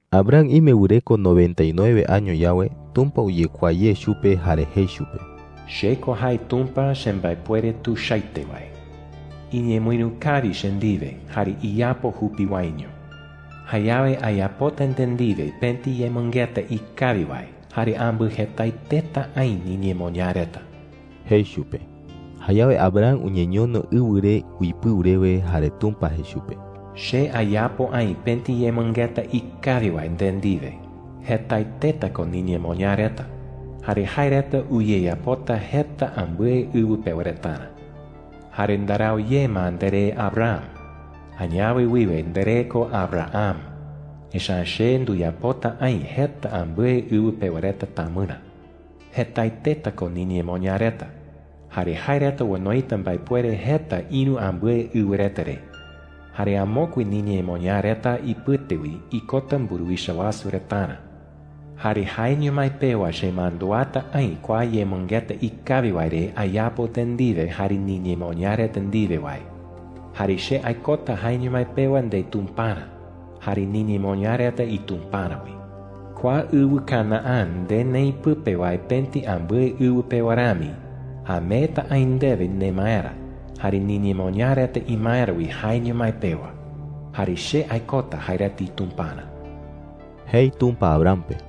Abram ime wɨreko noventa y nueve año yawe, Tumpa uyekuaa ye chupe jare jei chupe: “Che ko jae Tumpa chembaepuere tuichaete wae,” jei chupe. “Iñemɨïru kawi che ndiwe jare iyapo jupi waeño. Jayawe ayapota nde ndiwe pëti yemɨngeta ikawi wae, jare ambɨjetaeteta aï niñemoñaa reta,” jei chupe. Jayawe Abram uñeñono ɨwɨ re uipɨu rewe. Jare Tumpa jei chupe: “Che ayapo aï pëti yemɨngeta ikawi wae nde ndiwe. Jetaeteta ko niñemoñaa reta jare jae reta uyeyapota jeta ambɨe ɨwɨ pewa retarä,” jei chupe. “Jare ndarau ye ma nderee Abram. Añawe wiwe nderee ko Abraham, echa’ä che nduyapota aï jeta ambɨe ɨwɨ pewa reta tamɨrä. Jetaeteta ko niñemoñaa reta, jare jae reta onoita mbaepuere jeta ïru ambɨe ɨwɨ reta re. Jare amokue niñemoñaa reta ipɨte wi ikota mburuwicha wasu retarä,” jei. “Jare jaeño mái pewa chemanduata aï kua yemɨngeta ikawi wae re ayapo nde ndiwe jare niñemoñaa reta ndiwe wae. Jare che aikota jaeño mái pewa ndeTumparä jare niñemoñaa reta iTumparä wi,” jei. “Kua ɨwɨ Canaán nde neï pɨpe wae pëti ambɨe ɨwɨ pewa rami, ameeta aï ndewe nemaerä jare niñemoñaa reta imaerä wi jaeño mái pewa. Jare che aikota jae reta iTumparä,” jei Tumpa Abraham pe.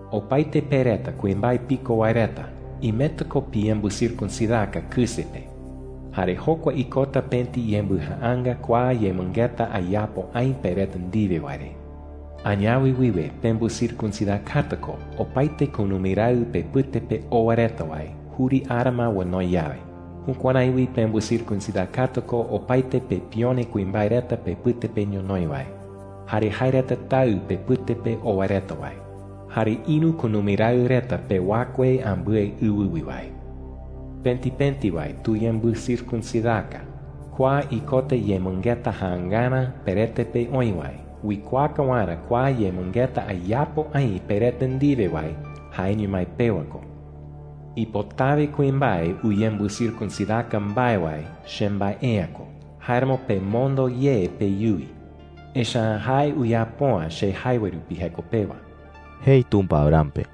“Opaete pe reta kuimbae piko wae reta imeta ko piyembɨcircuncidaka kɨse pe. Jare jokua ikota pëti yembɨjaanga kua yemɨngeta ayapo aï pe reta ndiwe wae re,” jei. “Añawe wiwe pembɨcircuncidakata ko opaete kunumi raɨ pepɨte pe oa reta wae juri ara ma onoi yawe. Jukuärái wi pembɨcircuncidakata ko opaete pepione kuimbae reta pepɨte pe ñonoï wae, jare jae reta taɨ pepɨte pe oa reta wae, jare ïru kunumi raɨ reta pewakue ambɨe ɨwɨ wi wae,” jei. “Pëti pëti wae tuyembɨcircuncidaka. Kua ikota yemɨngeta jaangarä perete pe oï wae uikuaaka waerä kua yemɨngeta ayapo aï pe reta ndiwe wae jaeño mái pewa ko,” jei. “Ipotawe kuimbae uyembɨcircuncidaka mbae wae chembae’ä ko. Jáeramo pemondo ye peyuwi, echa’ä jae uyapo’ä che jae wae rupi jeko pewa,” jei Tumpa Abraham pe.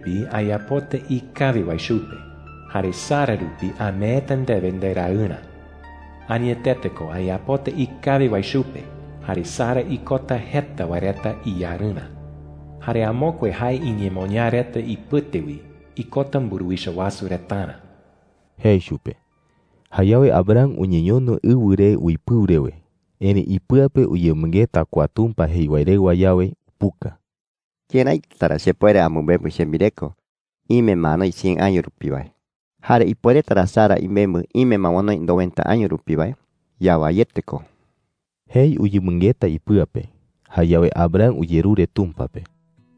“Jare chiñee rupi ayapota ikawi wae chupe, jare Sara rupi ameeta ndewe nderaɨrä. Añetete ko ayapota ikawi wae chupe jare Sara ikota jeta wae reta iyarɨrä. Jare amokue jae iñemoñaa reta ipɨte wi ikota mburuwicha wasu retarä,” jei chupe. Jayawe Abraham uñeñono ɨwɨ re uipɨu rewe. Erëi ipɨa pe uyemɨngeta kua Tumpa jei wae rewa yawe, upuka: “¿Këraita ra chepuere amɨmembɨ chembireko ime ma anoi cien año rupi wae? Jare ¿ipuereta ra Sara imembɨ ime ma onoi noventa año rupi wae? Yawaiete ko,” jei uyemɨngeta ipɨa pe. Jayawe Abraham uyerure Tumpa pe: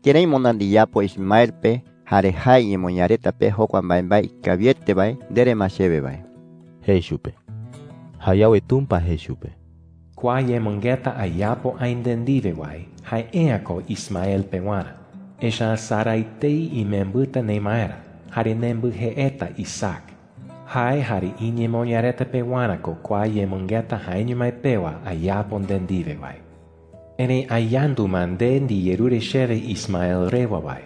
“Kërái moná ndiyapo Ismael pe jare jae iñemoñaa reta pe jokua mbaembae ikawiete wae ndere ma chewe wae,” jei chupe. Jayawe Tumpa jei chupe: “Kua yemɨngeta ayapo nde ndiwe wae, jae’ä ko Ismael pewarä. Echa’ä Sara etei imembɨta nemaerä jare nembɨjeeta Isaac. Tee Isaac uipota jei “puka” hebreo ñee pe. Jae jare iñemoñaa reta pewarä ko kua yemɨngeta jaeño mái pewa ayapo nde ndiwe wae,” jei chupe. “Erëi ayandu ma nde ndiyerure chewe Ismael rewa wae.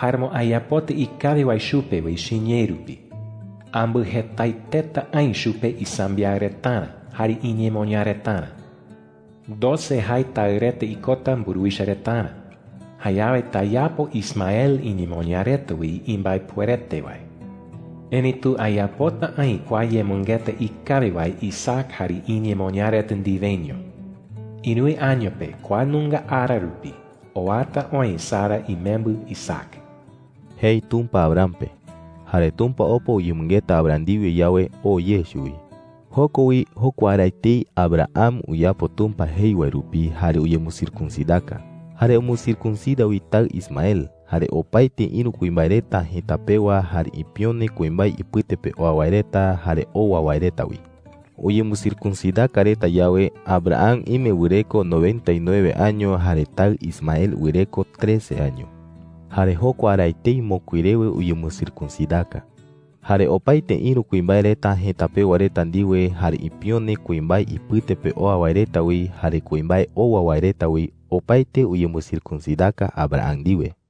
Jáeramo ayapota ikawi wae chupe wi chiñee rupi. Ambɨjetaeteta aï chupe isambiaɨ retarä jare iñemoñaa retarä. Doce jae taɨ reta ikota mburuwicha retarä. Jayawe tayapo Ismael iñemoñaa reta wi imbaepuerete wae,” jei chupe. “Erëitu ayapota aï kua yemɨngeta ikawi wae Isaac jare iñemoñaa reta ndiweño. Ïruwe año pe kua nunga ara rupi, oata oï Sara imembɨ Isaac,” jei Tumpa Abraham pe. Jare Tumpa opa uyemɨngeta Abraham ndiwe yawe, oo ye chuwi. Joko wi, jokua ara etei, Abraham uyapo Tumpa jei wae rupi jare uyembɨcircuncidaka. Jare umbɨcircuncida wi taɨ Ismael, jare opaete ïru kuimbae reta jëta pewa, jare ipione kuimbae ipɨte pe oa wae reta, jare owa wae reta wi. Uyembɨcircuncidaka reta yawe, Abraham ime wɨreko noventa y nueve año jare taɨ Ismael wɨreko trece año. Jare jokua ara etei mokui rewe uyembɨcircuncidaka. Jare opaete ïru kuimbae reta jëta pewa reta ndiwe, jare ipione kuimbae ipɨte pe oa wae reta wi, jare kuimbae owa wae reta wi, opaete uyembɨcircuncidaka Abraham ndiwe.